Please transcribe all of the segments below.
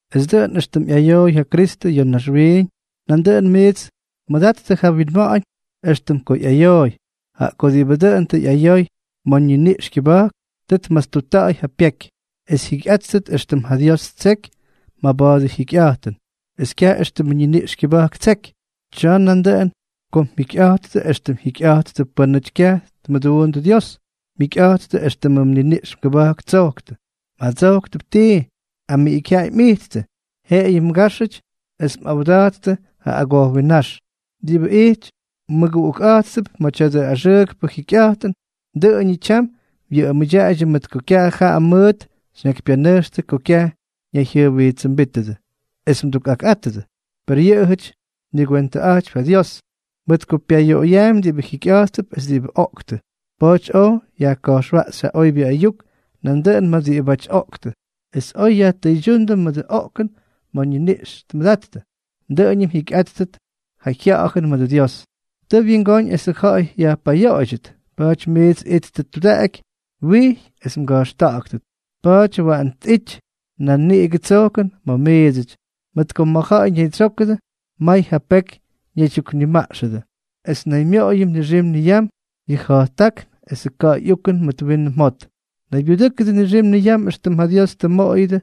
Es dʉꞌʉn éxtʉm ꞌyayooy ja Kristʉ ya̱ naxwiiñ, nandʉꞌʉn miits mʉdattʉ ja winma̱ꞌa̱ñ éxtʉm ko ꞌyayooy, jaꞌa ko diꞌibʉ dʉꞌʉn tʉ ꞌyayoy ma̱ ñiniꞌx kyʉba̱jk, tʉ tmastutta̱ꞌa̱y ja pyeky es jyikyꞌátʉt éxtʉm ja Dios ttseky maba̱a̱dʉ jyikyꞌa̱jtʉn, es kyaj éxtʉmʉ ñiniꞌx kyʉba̱jk ttseky. Tsyaꞌa nadʉꞌʉn ko mjikyꞌa̱jttʉ éxtʉm jyikyꞌattʉ pʉ́nʉty kyaj tmʉdundʉ Dios, mjikyꞌa̱jttʉ éxtʉm mniniꞌx mgʉba̱jk ttsojktʉ, mꞌadsojktʉp tii, amiꞌikyjyaꞌay mꞌijttʉ, jeꞌeyʉ mgáxʉty, es mꞌawda̱jttʉ ja agojwinnáx. Diꞌibʉ ijty mmʉguꞌukꞌa̱jttʉp ma̱ tya̱dʉ axʉʉkpʉ jikyꞌa̱jtʉn, dʉꞌʉñʉ tyam wyʉꞌʉmʉdyaꞌaydyʉ mʉt ko kyaj jaꞌa mʉʉt xyñakypyanʉjxtʉ ko kyaj ñayjyʉjwijtsʉmbítʉdʉ, es mdukꞌakꞌátʉdʉ. Per yʉꞌʉjʉty myʉgwentʉꞌa̱jtypy ja Dios, mʉt ko Dios pyayoꞌoyaampy diꞌibʉ jikyꞌa̱jttʉp es diꞌibʉ oꞌktʉ. Pa̱a̱ty oj yajka̱jxwaꞌxy ja oybyʉ ayuk nandʉꞌʉn ma̱ diꞌibáty oꞌktʉ, es oy yajtʉydyúndʉ mʉdʉ oꞌkʉn ma̱ ñiniꞌx tmʉda̱jttʉ, dʉꞌʉn jyikyꞌáttʉt ja jya̱ꞌa̱jʉn mʉdʉ Dios. Tʉʉ wyingóñ esʉ ja̱ꞌa̱y yajpayoꞌoydyʉt. Pa̱a̱ty miits ittʉ tudaꞌaky, wijy es mga̱jxta̱ꞌa̱ktʉt. Pa̱a̱ty waꞌan tꞌity nan niꞌigʉ tsojkʉn ma̱ miidsʉty, mʉt ko ma̱ ja̱ꞌa̱y ñaydsyókʉdʉ, may ja peky ñaydyuknimaꞌxʉdʉ. Es naymyoꞌoyʉdʉ nixim niyam yʉ ja̱jttákn esʉ ka̱ꞌa̱y ukʉn mʉt winʉ mjot. Naybyudʉ́kʉdʉ nixim niyam éxtʉm ja Dios tʉ mmoꞌoyʉdʉ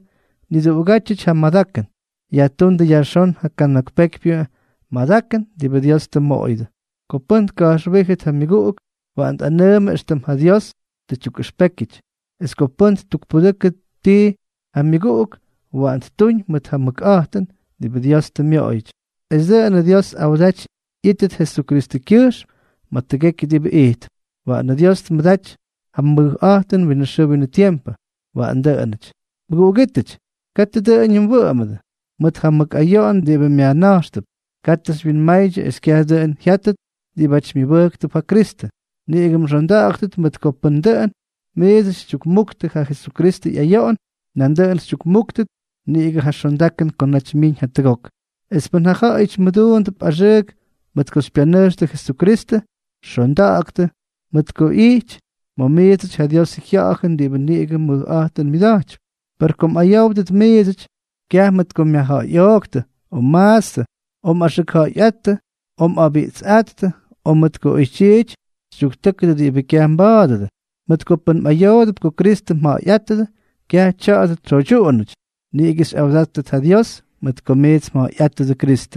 niduꞌugátyʉty ja madakʉn. Yajtúndʉ yajxón ja kana̱k pekypyʉ madakʉn diꞌibʉ Dios tʉ mmoꞌoyʉdʉ. Ko pʉ́n tka̱jxwíjʉt ja myʉguꞌuk, waꞌan tꞌanʉʉmʉ éxtʉm ja Dios tʉ tyukꞌʉxpékyʉty. Es ko pʉ́n ttukpudʉkʉ tii ja myʉguꞌuk, waꞌan ttuñ mʉt ja mʉkꞌa̱jtʉn diꞌibʉ Dios tʉ myoꞌoyʉty, es dʉꞌʉnʉ Dios awdaty ꞌyítʉt Jesukristʉkyʉjxm ma̱ tʉgekyʉ diꞌibʉ ijtp. Waꞌanʉ Dios tmʉdaty ja mʉjꞌa̱jtʉn winʉ xʉʉ winʉ tiempʉ. Waꞌan dʉꞌʉnʉty. Mʉguꞌugítʉty, katʉ dʉꞌʉñʉ mwʉꞌʉmʉdʉ mʉt ja mʉk ayoꞌon diꞌibʉ myajna̱jxtʉp. Katʉ xywyinmaydyʉ es kyaj dʉꞌʉn jyátʉt diꞌibáty myʉbʉjktʉp ja Kristʉ. Niꞌigʉ mxonda̱ꞌa̱ktʉt, mʉt ko pʉn dʉꞌʉn miits xytyukmuktʉ ja Jesukristʉ ꞌyayoꞌon, nandʉꞌʉn xytyukmúktʉt niꞌigʉ ja xondakʉn ko naty myiñ jatʉgok. Es pʉn ja ja̱ꞌa̱yʉty mduunʉdʉp axʉʉk mʉt ko xypyanʉjxtʉ Jesukristʉ, xonda̱ꞌa̱ktʉ, mʉt ko ꞌyity ma̱ miidsʉty ja Diosʉ Jya̱ꞌa̱jʉn diꞌibʉ niꞌigʉ mʉjꞌa̱jtʉn myʉda̱jtypy. Per ko mꞌayówdʉt miidsʉty, kyaj mʉt ko myajja̱ꞌa̱yꞌooktʉ, o mmaatstʉ, o mꞌaxʉkja̱ꞌa̱yꞌáttʉ, o mꞌabiꞌtsꞌáttʉ, o mʉt ko oytyiity xytyuktʉ́kʉdʉ diꞌibʉ kyaj mba̱a̱dʉdʉ. Mʉt ko pʉn mꞌayoodʉp ko Kristʉ mja̱ꞌa̱yꞌátʉdʉ, kyaj tya̱dʉ tsyoydyuꞌunʉty; niꞌigʉ xyꞌawdáttʉt ja Dios mʉt ko miits mja̱ꞌa̱yꞌátʉdʉ Kristʉ.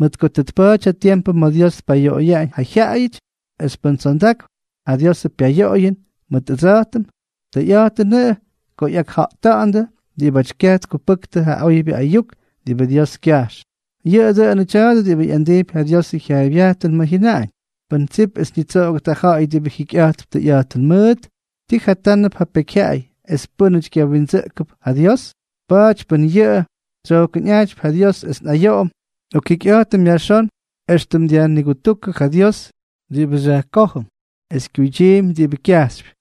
Mʉt ko tʉ tpa̱a̱ty ja tiempʉ ma̱ Dios tpayoꞌoyaꞌañ ja jyaꞌayʉty; es pʉn tsondakp ja Diosʉ pyayoꞌoyʉn mʉt ʉdsa̱jtʉm, tʉyꞌa̱jtʉnʉꞌʉ ko ꞌyakjata̱ꞌa̱ndʉ diꞌibáty kyaj tkupʉktʉ ja oybyʉ ayuk diꞌibʉ Dios kyajx. Yʉꞌʉ dʉnʉ tya̱a̱dʉ diꞌibʉ ꞌyandijpy ja Diosʉ jyaaybyajtʉn ma̱ jyʉnaꞌañ: “Pʉn tsip es ñitsoꞌogʉt ja ja̱ꞌa̱y diꞌibʉ jikyꞌa̱jtp tʉyꞌa̱jtʉn mʉʉt, ¿ti jatánʉdʉp ja pekyjyaꞌay es pʉ́nʉty kyawindsʉꞌkʉdʉp ja Dios?” Pa̱a̱ty pʉn yʉꞌʉ tsyojkʉnꞌa̱jtypy ja Dios es nꞌayoꞌom, nꞌokjikyꞌa̱jtʉm yajxón, éxtʉm dyajnigutúkʉ ja Dios diꞌibʉ xyajkójʉm es kyuydyiimpy diꞌibʉ kyajxypy.